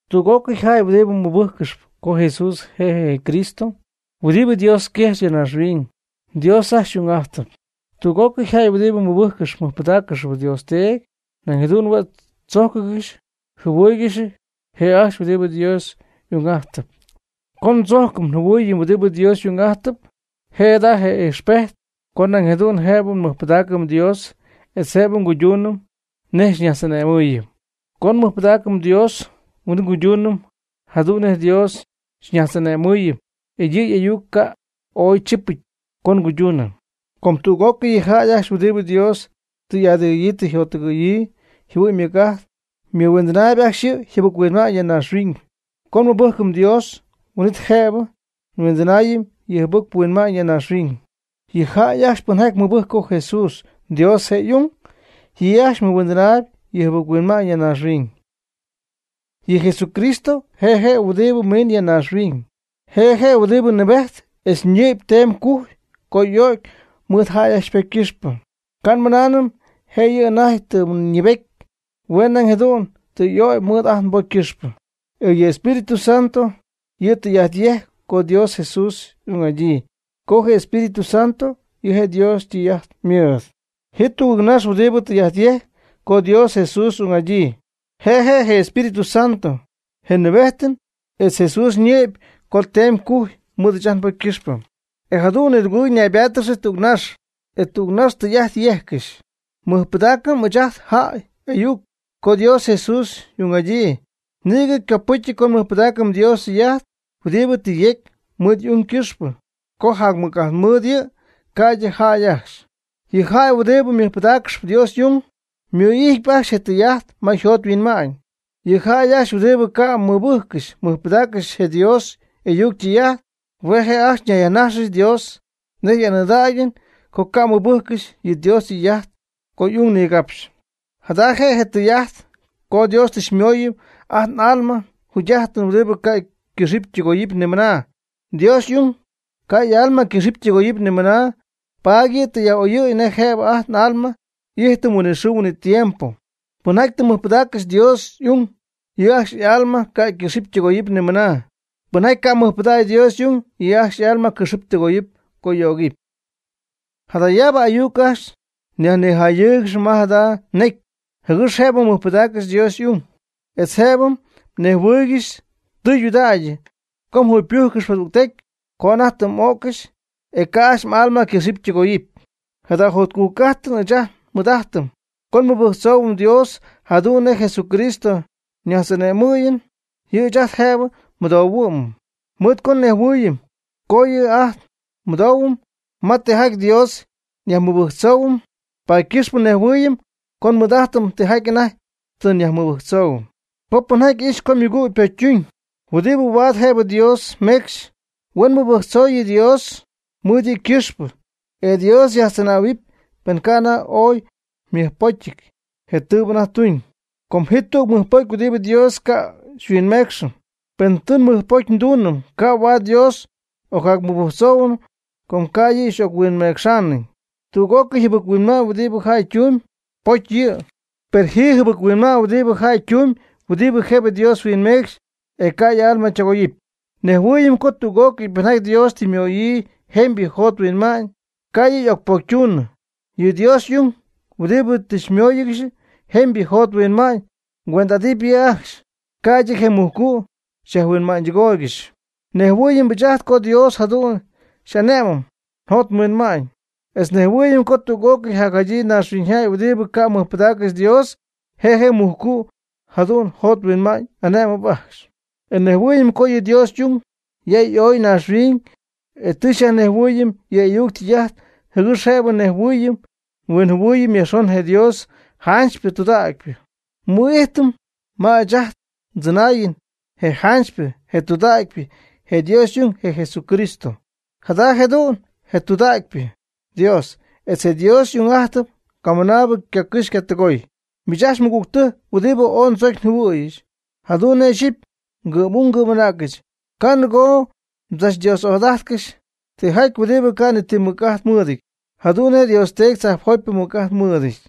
Tüg'ócɨy jäy huɨdibɨ mɨbɨjccɨxp co Jesús je' je' je Cristo huɨdibɨ Dios yquejx ya naaxhuiñ, Dios ajcxy y'ung'ajtɨp. Tüg'ócɨy jäy huɨdibɨ mɨbɨjccɨxp mɨjpɨdaaccɨxp Dios Teedy, nañ jadu'n huen tzojccɨxy yjɨhuɨɨygɨxy je' ajcxy huɨdibɨ Dios y'ung'ajtɨp. Co ndzojcɨm njɨhuɨɨyɨm huɨdibɨ Dios y'ung'ajtɨp, je' jada je' je ijxpejt co nañ jadu'n jëbɨ nmɨjpɨdaacɨm Dios etz jëbɨ nguyduunɨm nej xyñajtz'ane'mɨɨyɨm. Co nmɨjpɨdaacɨm Dios, huin'it nguyduunɨm jadu'n nej Dios xyñajtz'ane'mɨɨyɨm e yɨ' y'ayuc ca' ooy chipɨty co nguyduunɨm. Com tüg'ócɨy yɨ jäy ajcxy huɨdibɨ Dios tɨ y'adɨgɨ̈yii tɨ yjottɨgɨ̈yii yjɨhuɨ'ñ ymɨc'ajt, ymɨhuindɨnaayb ajcxy yɨ jɨbɨc-huinma'ñ ya naaxhuiñ. Co nmɨbɨjcɨm Dios, huin'it jëbɨ nmɨhuindɨnaayɨm yɨ jɨbɨc-huinma'ñ ya naaxhuiñ. Yɨ jäy ajcxy pɨnjaty mɨbɨjcp co Jesús Dios je' y'ung, yɨ' ajcxy mɨhuindɨnaayb yɨ jɨbɨc huinma'ñ ya naaxhuiñ. Yɨ Jesucristo je' je' huɨdibɨ miin ya naaxhuiñ, je' je' huɨdibɨ nɨɨbejt etz ñɨ'py teemy gujy co y'o'cy mɨɨd jäy ajcxy ypocy ycɨxpɨ. Ca' nmɨnaanɨm jëyɨ anajty tɨ ñɨɨbety, hue' nañ jadu'n tɨ y'ögy mɨɨd ajt nbocy ycɨxpɨ. E yɨ Espíritu Santo yɨ' tɨy'ajt yejcp co Dios Jesús y'ung'adyii, com je Espíritu Santo yɨ' Dios ytɨy'ajt ymɨɨd. Ji tugɨɨgnax huɨdibɨ tɨy'ajt yejcp co Dios Jesús y'ung'adyii: je Espíritu Santo, je nɨɨbejtɨn, etz Jesús ñɨ'py co teemy cujy mɨɨd ɨɨch ajt nbocy ycɨxpɨ. E jadu'n nidugɨɨg ñaybáatɨgɨxy tügnax, e tügnax ytɨy'ajt yejccɨxy. Mɨjpɨdaacɨm ɨɨch ajt jäy y'ayuc co Dios Jesús y'ung'adyii, nïgɨ copɨcy co nmɨjpɨdaacɨm Dios ytɨy'ajt huɨdibɨ tɨ yecy mɨɨd y'ung ycɨxpɨ, com jac mɨc'ajt mɨɨd yɨ' ca'ydɨ jäy ajcxy. Yɨ jäy huɨdibɨ mɨjpɨdaaccɨxp Dios y'ung, ymɨ'ijtpy ajcxy je tɨy'ajt ma yjot yhuinma'ñ. Yɨ jäy ajcxy huɨdibɨ ca' mɨbɨjccɨxy mɨjpɨdaaccɨxy je Dios y'ayuc ytɨy'ajt, hue' ajcxy yajnajxcɨxy Dios nej anɨɨdägyɨn co ca' mɨbɨjccɨxy yɨ Dios ytɨy'ajt co y'ung nigapxy. Jada je' tɨy'ajt co Dios tɨ xymooyɨm ajt n'alma yjugy'ajtɨn huɨdibɨ ca' ycɨxɨpy ytɨgoyɨpy nimɨna. Dios y'ung ca' y'alma ycɨxɨpy ytɨgoyɨpy nimɨna, paady yɨ' tɨ yaj'oyɨ̈y nej jëbɨ ajt n'alma y'ijtɨm huinɨxɨɨ huinɨtiempo. Pɨnjaty tɨ mɨjpɨdaaccɨxy Dios y'ung, yɨ' ajcxy y'alma ca' ycɨxɨpy ytɨgoyɨpy nimɨna. Pɨnjaty ca' mɨjpɨdägy Dios y'ung, yɨ' ajcxy y'alma cɨxɨpy tɨgoyɨpy co y'ögɨpy. Jadayaabɨ ayuc ajcxy nyajnijayɨɨygɨxp ma jada necy jɨgɨx jëbɨ mɨjpɨdáaccɨxɨpy Dios y'ung, etz jëbɨ mnejhuɨɨygɨxy tɨydudägy co mjugypɨ́jccɨxɨpy jadügtecy co anajty tɨ m'o'ccɨxy e ca' ajcxy m'alma ycɨxɨpy ytɨgoyɨpy. Jada jotcujc'ajtɨn ɨɨch ajt nmɨɨd'ajtɨm co nmɨbɨjctzoohuɨm Dios jadu'n nej Jesucristo xyñajtz'ane'mɨɨyɨm, yɨ' ɨɨch ajt jëbɨ xymɨdouhuɨm. Mɨɨd co nnejhuɨɨyɨm co yɨ' ajt xymɨdouhuɨm ma tijaty Dios nyajmɨbɨjctzouhuɨm, paady ycɨxp nejhuɨɨyɨm co nmɨɨd'ajtɨm tijaty anajty tɨ nyajmɨbɨjctzou. Co pɨnjaty ixy co ymɨgüg ypocytuñ huɨdibɨ huaad jëbɨ Dios meecxy, huen mɨbɨjctzooyɨ Dios mɨɨd yɨ' ycɨxpɨ, e Dios yajtzɨnähuɨɨyb pen ca' anajty ooy ymɨjpocyɨty je tɨɨbɨ anajty tuñ. Com ji tüg mɨjpocy huɨdibɨ Dios ca' huinmecxy. Pen tɨ mɨjpocytuñ ca' huaad Dios ocjacmɨbɨjctzoonɨ com ca' yɨ' y'oc-huinmecxaanɨ. Tüg'ócɨy jɨbɨc-huinma'ñ huɨdibɨ jäy ytumyb, pocy yɨ', per ji jɨbɨc-huinma'ñ huɨdibɨ jäy ytumyb, huɨdi jëbɨ Dios huinmecxy e ca' y'alma ytɨgoyɨp. Nejhuɨɨyɨm co tüg'ócɨy pɨnjaty Dios tɨ ymöyii jemybɨ jot huinma'ñ, ca' yɨ' y'ocpocytunɨ. Yɨ Dios y'ung, huɨdibɨ tɨ ymóoyɨgɨxy jemybɨ jot huinma'ñ, cuend'ajtɨp yɨ' ajcxy, ca'ydɨ je mujcu' xyajhuinma'ñydɨgóoyɨgɨxy. Nejhuɨɨyɨm ɨɨch ajt co Dios jadu'n xy'ane'mɨm njot nhuinma'ñ etz nejhuɨɨyɨm co tüg'ócɨy jacjadyii naaxhuiñyjäy huɨdibɨ ca' mɨjpɨdaaccɨxy Dios, je mujcu' jadu'n yjot yhuinma'ñ y'ane'mɨp ajcxy. E nejhuɨɨyɨm co yɨ Dios y'ung ya y'oy naaxhuiñ e tɨ xyajnejhuɨɨyɨm yɨ' y'ayuc ytɨy'ajt, jɨgɨx jëbɨ nejhuɨɨyɨm huinjɨhuɨɨyɨm yajxon je Dios janchypɨ tudägypɨ. Nmɨ'ijtɨm ma ɨɨch ajt ndzɨnaayɨn je janchypɨ je tudägypɨ je Dios y'ung je Jesucristo. Jada jëdu'n je tɨydudägypɨ Dios, etz je Dios yjugy'ajtɨn camɨnaabɨ ycacɨxy ycatɨgoy. Miich ajcxy mɨgügtɨjc huɨdibɨ ooy ndzocy njɨhuɨ̈yɨch jadu'n nej ixyipy ngɨ'm'ung ngɨ'm'anäcɨch, ca' nɨgoo mdzachDios'ájtɨgɨxy tijaty huɨdibɨ ca' ni ti mɨc'ajt mɨɨdɨty, jadu'n nej Dios Teedy tzajpjotypɨ ymɨc'ajt mɨɨdɨty.